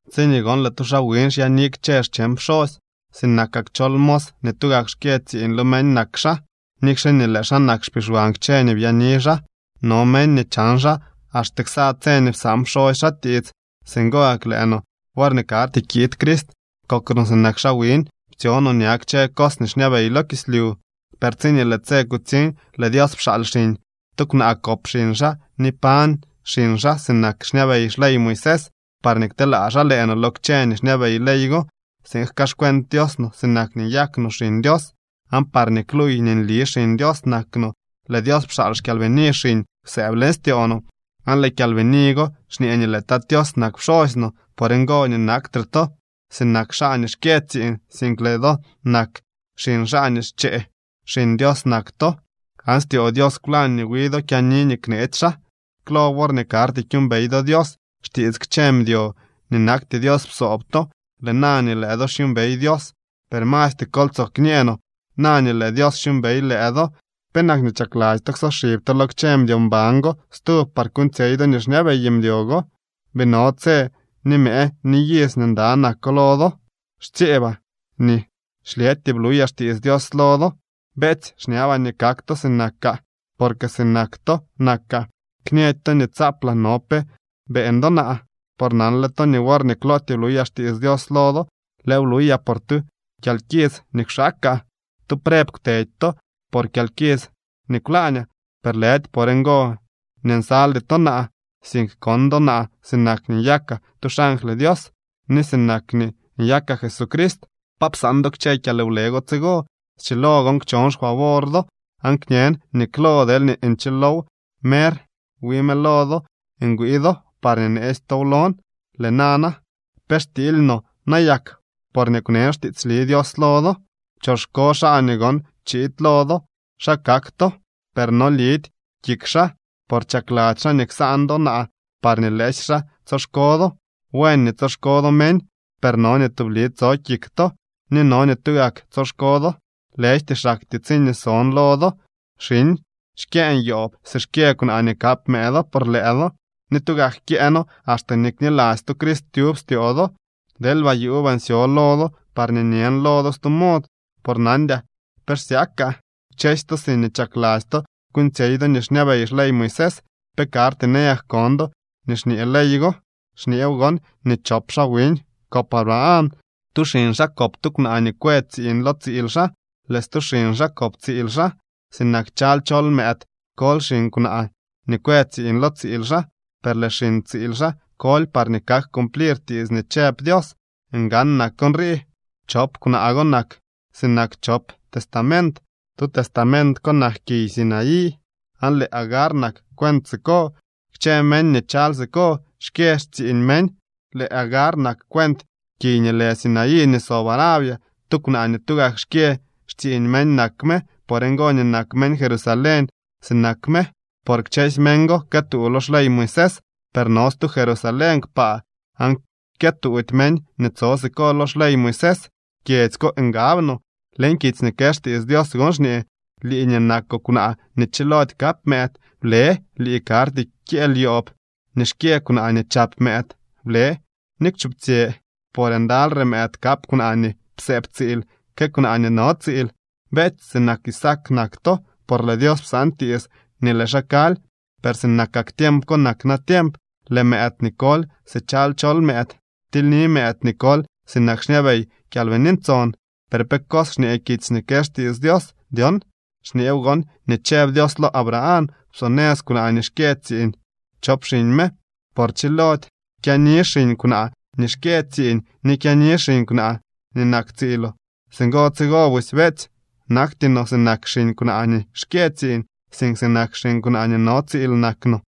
Tsiñee gon lëë tu xaa wiñ xyaani kchë xcheñ pxosy, sinakak chol mos nii tugak xkyë tsiiñ lo meñ nak xaa, nikxe nii lëë xaa nak xpixwan kchë nii byaani xaa. No meñ nii chan xaa, axte xsa tse nii psaan pxosy xaa tiits. Singo gak lëë no, worñee karty kiid Crist, kok no sinak xaa wiñ. Ptsyo no ña kchë cos nii xñabey lo kislyu. Per tsiñee lëë tse kutsiñ, lëë Dios pxaal xiñ. Tu kwnaa kop xiñ xaa ni pañ xiñ xaa sinak xñabey xley Moisés parñee kteelaa xaa lëë no lo kchë nii xñabey ley go, tsiin jkaaxcuent Dios no sinak nii nyak no xiñ Dios, aan parñee kluuy nii nli xiñ Dios nak no, lëë Dios pxaal xKyalbini xiñ kwsëëb leñ styoo no, aan lëë Kyalbini go xñee nii lëë Tat Tios nak pxosy no. Por ngo nii naktre to sinak xaa nii xkyë tsiiñ, sink lëë do nak xiñ xaa nii xchee. Xiñ Dios nak to aan styoo Dios kwlañ nii wi do kyaani nii kneetsy xaa. Klo worñee karty kyuumbey do Dios, xtiits kchë mdyo nii nakty Dios psoob to. Lëë na nii lëë do xyuumbey Dios, per masty kol tsoo kñee no, na nii lëë Dios xyuumbey lëë do, ¿penak chakladzy to ksoxib to lo kchë mdyo mban go stub par kuuñtsyey do nii xñabey mdyo go? Bii no tse, ni mëë, ni iz nii nda nako lo do. Xtsyeebaa nii xlyëtyee bluyaa xtiits Dios lo do. Beetsy, xñabaa nii kak to sinakaa, porque sinak to nakaa. Kñëdy to nii tsaaplaa no pe beeñ do naa. Por nanle to nii worñee klootyee bluyaa xtiits Dios lo do, lëëw bluyaa por tu kyalkits nii kwxaakaa. Tu preb kwteedy to por kyalkits nii kwlaañaa. Per lëdy por ngo nii nsaldy to naa, sink kon do naa sinak nii nyakaa tu xangly Dios, ni sinak nii nyakaa Jesucrist. ¿Pa psaan do kchë kyalwle go tsigo? Schilo gon kchon xfavor do aan kñen nii klo deelñee nchilow mer wi mëlo do ngwii do parñee neetsy tow lon. Lëë nana, ¿pe xtiily no nayak porñee kwnen xtiitsli Dios lo do? Choxko xaa nii gon chiid lo do xa kak to, per no lidy kik xaa, por chakladzy xaa nii ksaan do naa parñee lëësy xaa tsoxko do. Buen nii tsoxko do meñ, per no nii tubli tso kik to, ni no nii tugak tsoxko do, lëjty xaktyee tsiñee son lo do. Xiñ, xkyëën yoob si xkyë kwnaa nii kap mëëdo por lëë do, ni tugak kyëëno axte nii kniladzy to Crist tyub styoo do. ¡Deelba yuubaa nsyo lo do parñee nyën lo do stu mod, por nandyaa pe xsyakaa! Kchësy to siñee chakladzy to kuuñtsyey do nii xñabey xley Moisés, ¿pe karty nayak kon do nii xñee ley go? Xñeew gon nii chop xaa wiñ kop Abraham. Tu xiñ xaa kop tu kwnaa nii kwë tsiiñ lo tsiil xaa, lëë stu xiñ xaa kop tsiil xaa. Sinak chaly chol mëëd koly xiñ kwnaa nii kwë tsiiñ lo tsiil xaa, per lëë xiñ tsiil xaa koly parñee kak cumplir tiits nii chëb Dios. Ngan nak nrii. Chop kwnaa go nak sinak chop testament. Tu testament ko nak kiy Sinaí, aan lëë Agar nak cuent siko. Kchë meñ nii chaly siko xkyë xtsiiñ meñ. Lëë Agar nak cuent kiy nii lë Sinaí nii sob Arabia. Tu kwnaa nii tugak xkyë xtsiiñ meñ nak me. Por ngo nii nak meñ Jerusalén sinak me, por kchësy meñ go këtuu lo xley Moisés. Per no stu Jerusalén kpaa, aan kyëtuudy meñ nii tso siko lo xley Moisés. Kyedzy ko ngab no. Leñ kitsy nii kë xtiits Dios gon xñee: Lii nii nakoo kwnaa nii chilody kap mëëd, ble. Lii nii karty kyëël yoob nii xkyë kwnaa nii chap mëëd, ble ni kwchuptsyë. Porque ndalyre mëëd kap kwnaa nii psëëb tsiil que kwnaa nii no tsiil. Beetsy, sinak Isaac nak to, por lëë Dios psaan tiits nii lëë xaa kaly. Per sinakak tiemp ko nak natiemp. Lëë mëëd nii koly si chaly chol mëëd ptilyni mëëd nii koly sinak xñabey Kyalbini Ntson. ¿Per pe cos xñee kitsy nii kë xtiits Dios dyon? Xñeew gon nii chëb Dios lo Abraham: “Psonëz kwnaa nii xkyë tsiiñ chop xiñ me, por chilody kyaani xiñ kwnaa nii xkyë tsiiñ nii kyaani xiñ kwnaa nii nak tsiiloo.” Singo tsigo busy, beetsy, nakty no sinak xiñ kwnaa nii xkyë tsiiñ, sink sinak xiñ kwnaa nii no tsiil nak no.